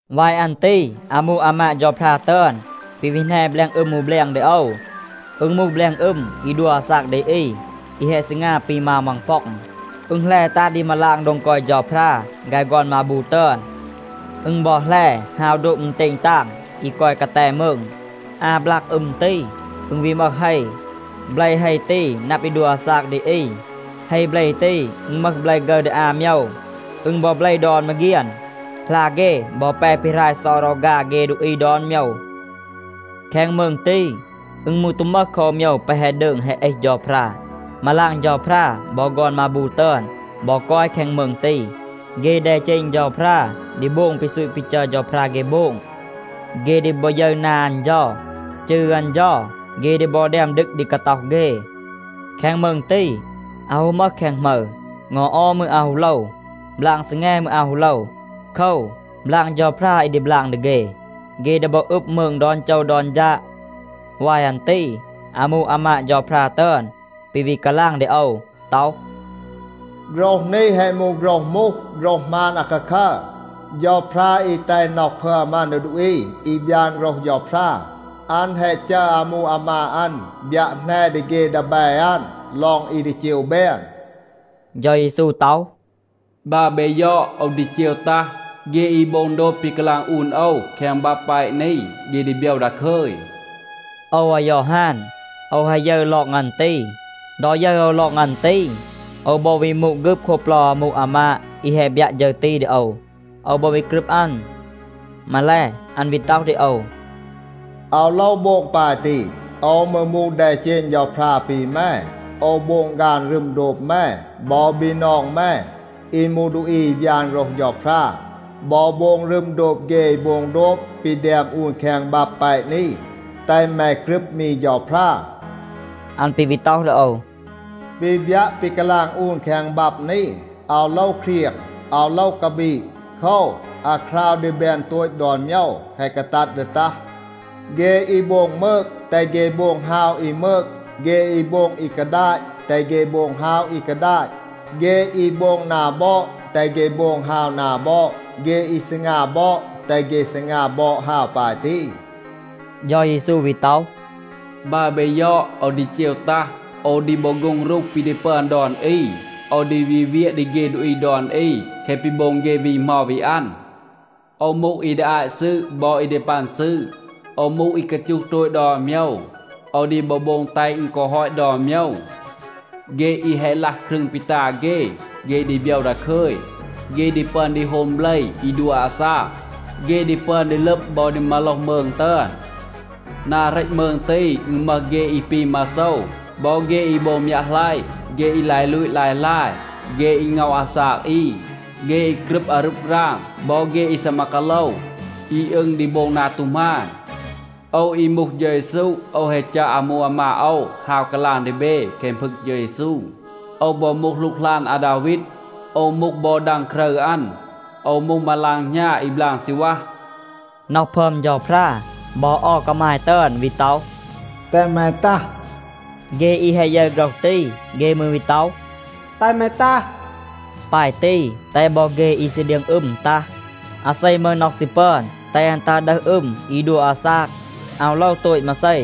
วาย อัน ตี อามู อามาด เฌาพรา ตึอน ปี วี แหน แบลง อึม อู แบลง ดี โอว. อึณ มูห แบลง อึม อี ดัว อาซาก ดี อี อี แฮะ ซีงา ปี มาว มังป็อง. อึณ แหล ตัห ดี มาลาง โดง กอย เฌาพรา ฆาย ฆอน มาบู ตึอน. อึณ บอ แหล ฮาว โดบ อึณเตณ ตาง อี กอย กาแต มืง. อา บลาก อึม ตี, อึณ วี มึห เฮ. เบล เฮ ตี นับ ดี ดัว อาซาก ดี อี. เฮ เบล ตี, อึณ มึห เบล ฆึร ดี อา โมยว. อึณ บอ เบล ดอน มาเฆียน. หลา เฆ บอ แป ปีหราย เซา รอฆา เฆ ดูอี ดอน โมยว. แคง มืง ตี, อึณ มืร ตู มึห คอ อู โมยว แปะ แฮะ ดืง แฮะ เอห เฌาพรา. มาลาง เฌาพรา บอ ฆอน มาบู ตึอน บอ กอย แคง มืง ตี. เฆ แดเจณ เฌาพรา ดี โบง ปี ซูต ปี จัร เฌาพรา เฆ โบง. เฆ ดี บอ ยึร นา อัน เฌา. จืร อัน เฌา เฆ ดี บอ แดม ดึก ดี กาต็อห เฆ. แคง มืง ตี, อาว ฮู มึห แคง หมึร. เงา ออม มืร อาว ฮู โลว. บลาง ซีแง มืร, อาว ฮู โลว. โคว, บลาง เฌาพรา อี ดี บลาง ดี เฆ. เฆ ดี บอ อึบ มืง ดอน โจว ดอน ฌาด. วาย อัน ตี อามู อามาด เฌาพรา ตึอน ปี วี กาลาง ดี โอว ต็อห, “โฆรห นี แฮะ มูห โฆรห มูห, โฆรห หมาน อาคาคัร. เฌาพรา อี แตห น็อห พึอม อัน ดี ดูอี อี บยาน โฆรห เฌาพรา, อัน แฮะ จัร อามู อามาด อัน บยัะ แหน ดี เฆ ดีแบ อัน ลอง อี ดี เจว แบน.” เฌา เยซู ต็อห, “บัร เบ ยอด, โอว ดี เจว ตัห. เฆ อี โบง โดบ ปี กาลาง อูน โอว แคง บับ แปะ นี, เฆ ดี โบยว ดาคึย.” โอว อายอฮาน, โอว แฮะ ยึร ลอง อัน ตี. ดอ ยึร โอว ลอง อัน ตี, โอว บอ วี มูด ฆึบ โคบ เปลา อามู อามาด อี แฮะ บยัะ ฌึร ตี ดี โอว. โอว บอ วี กรึบ อัน. มาแล, อัน วี ต็อห ดี โอว, “อาว โลว โบง ปาย ตี, โอว มืร มูห แดเจณ เฌาพรา ปี แม. โอว โบง ฆาน รึม โดบ แม บอ บีนอง แม อี มูห ดูอี อี บยาน โฆรห เฌาพรา, บอ โบง รึม โดบ เฆ อี โบง โดบ ปี แดม อูน แคง บับ แปะ นี. แตห แม กรึบ มี เฌาพรา.” อัน ปี วี ต็อห ดี โอว, “ปี บยัะ, ปี กาลาง อูน แคง บับ นี, อาว โลว เครียง, อาว โลว กาบีด. โคว, อาคราว ดี แบน โตต ดอน โมยว แฮะ กาตัด ดี ตัห. เฆ อี โบง มืก, แตห เฆ โบง ฮาว อี มืก. เฆ อี โบง อี กาดาต, แตห เฆ โบง ฮาว อี กาดาต. เฆ อี โบง นา บอด, แตห เฆ โบง ฮาว นา บอด. เฆ อี ซีงา บอด, แตห เฆ ซีงา บอด ฮาว ปาย ตี.” เฌา เยซู วี ต็อห, “บัร เบ ยอด, โอว ดี เจว ตัห. โอว ดี บอ โฆ็ง รูห ปี ดี ปึอน ดอน อี. โอว ดี วี เวียะ ดี เฆ ดูอี ดอน อี แคะ ปี โบง เฆ วี เหมา วี อัน. โอว มูห อี ดี อาต ซืด บอ อี ดี ปัน ซืด. โอว มูห อี กาจูห โตต ดอน โมยว. โอว ดี บอ โบง แตห อึณ กอ ฮอต ดอน โมยว. เฆ อี แฮะ ลัห ครึง ปี ตา เฆ, เฆ ดี โบยว ดาคึย. เฆ ดี ปึอน ดี โฮม เบล อี ดัว อาซาก. เฆ ดี ปึอน ดี ลึบ บอ ดี มาโลห มืง ตึอน. นา เรต มืง ตี, อึณ มึห เฆ อี ปี มาโซว บอ เฆ อี โบง มยัะหลัยะ, เฆ อี ลาย ลูต ลาย ลาย, เฆ อี ง็อห อาซาก อี, เฆ อี กรึบ อารึบ ราง บอ เฆ อี ซีมา กาโลว, อี อึง ดี โบง นา ตู หมาน. โอว อี มูห เฌา เยซู, โอว แฮะ จัร อามู อามาด โอว ฮาว กาลาง ดี เบ แคง พึง เฌา เยซู. โอว บอ มูห หลูกหลาน อาดาวีด. โอว มูห บอ ดัง ครึร อัน. โอว มูห มาลาง หณา อี บลาง ซีณวัห.” น็อห พึอม เฌาพรา บอ เอา กามาย ตึอน วี ต็อห, “แตห แม ตัห.” เฆ อี แฮะ ยึร โฆรห ตี, เฆ มืร วี ต็อห, “แตห แม ตัห.” ปาย ตี, แตห บอ เฆ อี ซี เดียง อึม ตัห. อาเซ มึห น็อห ซี ปึอน, แตห อัน ตัห ดึห อึม อี ดัว อาซาก. อาว โลว โตต มาเซ.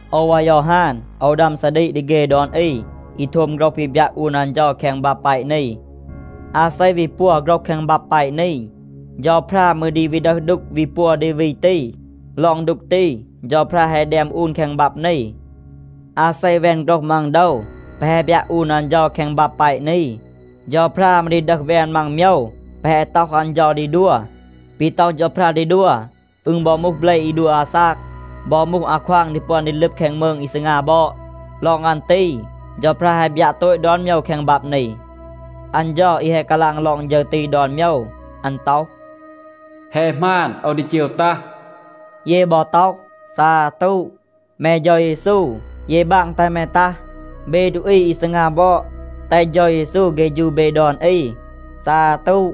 โอว อายอฮาน, โอว ดัม ซาดีก ดี เฆ ดอน อี อี โทม โฆรห ปี บยัะ อูน อัน เฌา แคง บับ แปะ นี. อาเซ วี ปัว โฆรห แคง บับ แปะ นี, เฌาพรา มืร ดี วี ดึห ดูก วี ปัว ดี วี ตี. ลอง ดูก ตี เฌาพรา แฮะ แดม อูน แคง บับ นี. อาเซ แวน โฆรห มัง โดว แปะ แฮะ บยัะ อูน อัน เฌา แคง บับ แปะ นี, เฌาพรา มืร ดี ดึห แวน มัง โมยว แปะ แฮะ ต็อห อัน ดี ดัว. ปี ต็อห เฌาพรา ดี ดัว, อึณ บอ มูห เบล อี ดัว อาซาก, บอ มูห อาควาง ดี ปึอน ดี ลึบ แคง มืง อี ซีงา บอด. ลอง อัน ตี เฌาพรา แฮะ บยัะ โตต ดอน โมยว แคง บับ นี. อัน เฌา อี แฮะ กาลาง ลอง ฌึร ตี ดอน โมยว อัน ต็อห, “แฮะ หมาน, โอว ดี เจว ตัห.” เย บอ ต็อห, “ซาตู, แม เฌา เยซู, เย บาง แตห แม ตัห.” เบ ดูอี อี ซีงา บอด, แตห เฌา เยซู เฆฌู เบ ดอน อี. ซาตู.